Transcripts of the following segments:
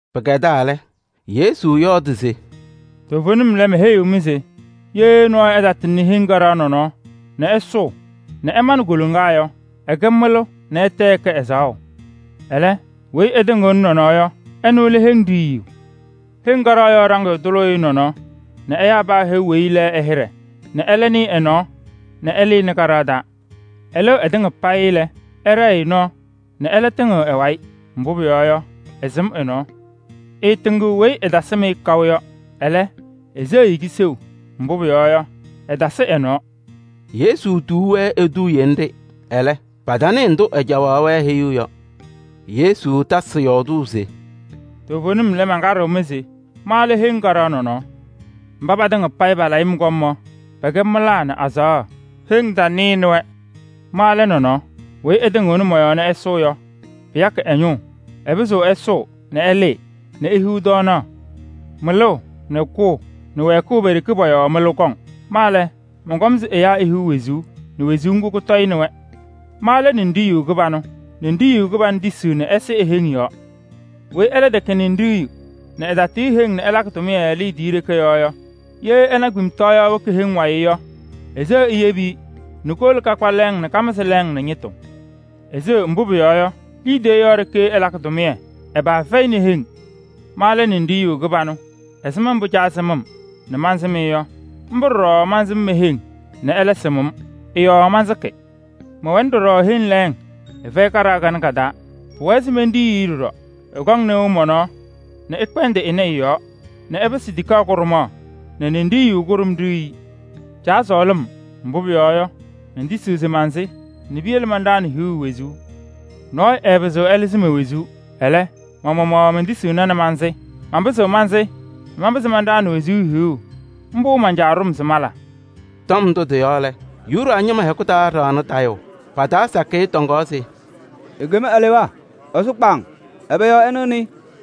Pɩkɛdaa lɛ, Yesu yɔɔdɩ se: “Toovenim lɛ, meheyiɣ-mɩ se: ye nɔɔyʋ ɛtatɩŋnɩ heŋ kaɖaɣ nɔnɔɔ nɛ ɛsʋʋ nɛ ɛmanɩ koloŋa yɔ, ɛkɛ mɩlʋ nɛ ɛtɛ ɛkɛ ɛzaɣʋ. Ɛlɛ, weyi ɛtɩŋɩɣnɩ nɔnɔɔ yɔ, ɛnʋ lɛ heŋ ɖiyiyu. Kaɖaɣ yɔɔ ɖaŋɩyʋ tʋlʋʋ-ɩ nɔnɔɔ nɛ ɛyaa paa e-heu weyi ɛ-hɩɖɛ nɛ ɛlɛ nɩɩ ɛ-nɔɔ nɛ ɛlɩnɩ kaɖaɣ taa. Ɩlɩɣ ɩtɩŋa payɩ lɛ, ɛɖɛɛ-ɩ nɔɔ nɛ ɛlɛ tɩŋɩɣ ɛ-wayɩ, mbʋ pʋyɔɔ yɔ, ɩsɩm ɛ-nɔɔ. Ɩɩtɩŋɩɣ weyi ɩtasɩm-ɩ yɔ kaʋ, ɛlɛ, iseɣ-i kiseu, mbʋ pʋyɔɔ yɔ, ɩtasɩ ɛ-nɔɔ.” Yesu tuu-wɛ eduuye nɖɩ, ɛlɛ, patanɩɩ ndʋ ɛcaɣaɣ-wɛ heyuu yɔ. Yesu tasɩ yɔɔdʋʋ se: “Toovenim lɛ, mankaɖɩɣ-mɩ se ma lɛ heŋ kaɖaɣ nɔnɔɔ. Mba patɩŋa payɩ palayɩ-m kɔm yɔ, pɛkɛ mɩlaa nɛ azaɣa. Heŋ tanɩnɩ-wɛ. Ma lɛ nɔnɔɔ. Weyi ɛtɩŋɩɣnɩ mɔ-yɔɔ nɛ ɛsʋʋ yɔ, pɩyakɩ ɛ-ñʋʋ. Ɛpɩzɩɣ ɛsʋʋ nɛ ɛlɩɩ nɛ ehiɣ ɖɩtɔɔyɛ. Mɩlʋʋ nɛ kʋʋ nɛ wɛɛkʋʋ pe-ɖeke pɔ-yɔɔ mɩlʋ kɔŋ. Ma lɛ, mɔnkɔm se heŋ ihiɣ wezuu nɛ kʋtɔyɩnɩ-ɩ. Ma lɛ ninɖiɣyu kɩbanʋ. Ninɖiɣyu kɩbanʋ tisiɣ nɛ ɛsɩ e-heŋ yɔɔ. Weyi ɛlɛ tɛkɛ ninɖiɣyu nɛ ɛtatɩɣyɩ heŋ nɛ ɛlakɩ tʋmɩyɛ liidiye ɖeke yɔɔ yɔ, ye ɛna kpemtɔɔyaɣ woki heŋ wayɩ yɔ, eseɣ eyebi-i nɛ kowolo kakpa lɛɛŋ nɛ kamɩzɩ lɛɛŋ nɛ ñɩtʋ. Eseɣ, mbʋ pʋyɔɔ yɔ, liidiye yɔɔ ɖeke ɛlakɩ tʋmɩyɛ, ɛ-paa fɛyɩnɩ heŋ. Ma lɛ Ninɖiɣyu kɩbanʋ. Ɛzɩma mbʋ Caa sɩm-m nɛ mansɩm-ɩ yɔ, mbʋ ɖɔɖɔ mansɩm me-heŋ nɛ ɛlɛ sɩm-m. Ɩ-yɔɔ mansɩkɩ. Mɛwɛnɩ ɖɔɖɔ heŋ lɛɛŋ, ɩfɛyɩ kaɖaɣ kanɛ ka-taa. Pʋwɛɛ se menɖiyi-i ɖɔɖɔ. Ɩkɔŋ nɩʋ mɔ-nɔɔ nɛ ɩkpɛndɩ ɩnɛ ɩ-yɔɔ nɛ ɩpɩsɩ tikaɣ kʋɖʋmaɣ nɛ ninɖiɣyu kʋɖʋm ɖiyi-i. Caa sɔɔlɩ-m, mbʋ pʋyɔɔ yɔ, mentisiɣ se mansɩ nɛ piyele manɖaɣnɩ hiɣu wezuu. Nɔɔyʋ ɛɛpɩzɩɣ ɛlɩzɩ me-wezuu. Ɛlɛ, ma-maɣmaɣ mentisiɣna nɛ mansɩ. Manpɩzɩɣ mansɩ nɛ manpɩzɩ manɖaɣnɩ wezuu hiɣu. Mbʋ man-Caa ɖʋ-m se mala.” Tɔm ndʋ tɩ-yɔɔ Yuda ñɩma hɛkʋ taa ɖaɣnɩ tayʋʋ. Pa-taa sakɩyɛ tɔŋaɣ se: “Ekem alewaa! Ɛsʋ kpaaŋ! Ɛbɛ yɔɔ ɩnɩɣnɩ-ɩ?”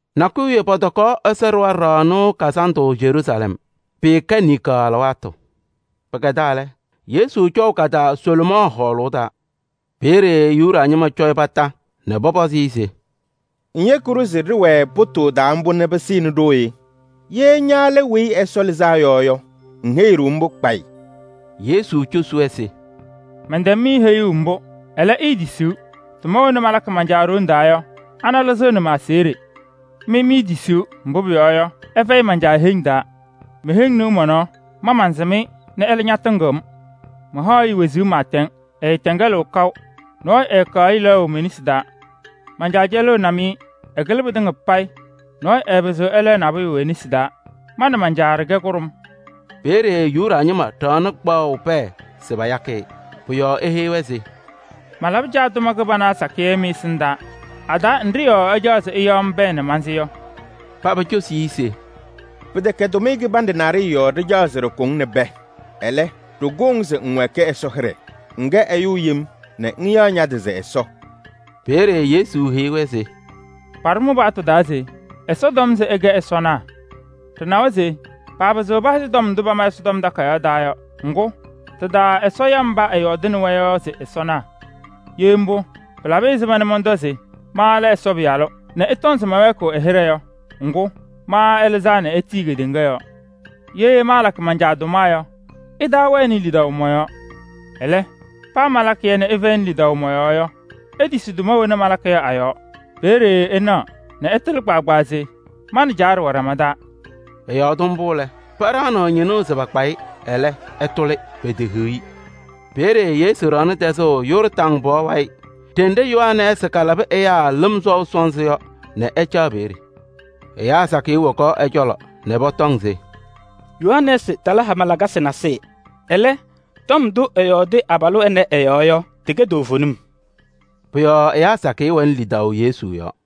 Nakʋyʋ wiye pɔtɔkaɣ Ɛsɔ Ɖɩɣa Ɖaɣnʋʋ Kazandʋ Yeruusalɛm. Pɩɩkɛ niŋkaɣ alɩwaatʋ. Pɩkɛdaa lɛ, Yesu cɔʋ ka-taa Salomɔɔ Hɔɔlʋʋ taa. Peeye Yuda ñɩma cɔ-ɩ kondiko nɛ pɔpɔzɩ-ɩ se: “Ŋyeki-ɖʋ se ɖɩwɛɛ pʋtʋʋ taa mbʋ nɛ pɩsɩnɩ ɖooye? Ye ña lɛ Weyi Ɛsɔ Lɩzaa Yɔ yɔ, ŋheyi-ɖʋ mbʋ kpayɩ.” Yesu cosi-wɛ se: “Mɛntɛm-mɩ heyuu mbʋ, ɛlɛ, iitisiɣ. Tʋma wena malakɩ man-Caa ɖoŋ taa yɔ, ana lɩzɩɣnɩ ma-aseɣɖe. Mɩ miitisiɣ, mbʋ pʋyɔɔ yɔ, ɩfɛyɩ me-heŋ taa. Me-heŋ nɩɣ mɔ-nɔɔ. Ma mansɩm-ɩ nɛ ɛlɛ ñatɩŋɩɣ-m. Mahaɣ-ɩ wezuu pɩɩtɛŋ, ɩɩtɛŋɛlɩɣ kaʋ. Nɔɔyʋ ɛɛkaɣ-ɩ lɛɣʋ me-nesi taa. Man-Caa cɛlɩnɩ-m-ɩ, ɛkɩlɩ pɩtɩŋa payɩ, nɔɔyʋ ɛɛpɩzɩɣ ɛlɛɣ-ɩ e-nesi taa. Ma nɛ man-Caa ɖɩkɛ kʋɖʋm.” Peeye Yuda ñɩma ɖaɣnɩ kpaɣʋ pɛɛ se payakɩ-ɩ. Pʋ-yɔɔ eheyi-wɛ se: “Malabɩ Caa tʋma kɩbana sakɩyɛ mɩ-ɛsɩndaa. A-taa nɖɩ yɔɔ ɩcaɣ se ɩyaɣ-m pɛɛ nɛ mansɩ yɔ?” Paba cosi-i se: “Pɩtɛkɛ tʋmɩyɛ kɩbanɖɛ naɖɩyɛ yɔɔ ɖɩcaɣ se ɖɩkʋ-ŋ nɛ pɛɛ. Ɛlɛ, ɖɩkʋʋ-ŋ se ŋwɛɛkɩ Ɛsɔ hɩɖɛ: ŋkɛ ɛyʋ yem nɛ ŋyaɣ ña-tɩ se Ɛsɔ.” Peeye Yesu heyi-wɛ se: “Paɖʋ mɩ-paɣtʋ taa se: ‘Ɛsɔ tɔm se ɩkɛ ɛsɔnaa.’ Ɖɩnawa se paapɩzɩɣ pahɩzɩ tɔm ndʋ pama Ɛsɔtɔm Takayaɣ taa yɔ. Ŋgʋ, tɩ-taa Ɛsɔ ya mba ɛyɔɔdaɣnɩ-wɛ yɔ se ɛsɔnaa. Ye mbʋ lɛ, pɩlabɩ ɛzɩma mɔntɔ se: ma lɛ Ɛsɔ Pɩyalʋ nɛ ɩtɔŋ se mɛwɛɛkɩɣ ɛ-hɩɖɛ yɔ? Ŋgʋ, ma ɛlɩzaa nɛ etiyi kedeŋa yɔɔ. Ye maalakɩ man-Caa tʋma yɔ, ɩtaawɛnɩ lidaʋ mɔ-yɔɔ. Ɛlɛ, paa malakɩ-yɛ nɛ ɩfɛyɩnɩ lidaʋ mɔ-yɔɔ yɔ, itisi tʋma wena malakɩ yɔ a-yɔɔ. Peeye ɩnaɣ nɛ ɩtɩlɩ kpaagbaa se ma nɛ Caa ɖɩwɛ ɖama taa.” Ɛyɔɔdɩ mbʋ lɛ, paɖaɣnɩɣ ñɩnʋʋ se pakpa-ɩ, ɛlɛ, ɛtʋlɩ, petehiɣ-i. Peeye Yesu ɖaɣnɩ tɛzʋʋ Yɔɔrdaŋ pɔɔ wayɩ ɖenɖe Yohanɛɛsɩ kalabɩ ɛyaa lɩm sɔʋ sɔnzɩ yɔ nɛ ɛcaɣ peeye. Ɛyaa sakɩyɛ wokaɣ ɛ-cɔlɔ nɛ pɔtɔŋ se: “Yohanɛɛsɩ tala hama lakasɩ nasɩyɩ. Ɛlɛ, tɔm ndʋ tɩtɩŋa ɛyɔɔdɩ abalʋ ɛnɛ ɛ-yɔɔ yɔ, tɩkɛ toovenim.” Pʋ-yɔɔ ɛyaa sakɩyɛ wɛnɩ lidaʋ Yesu yɔɔ.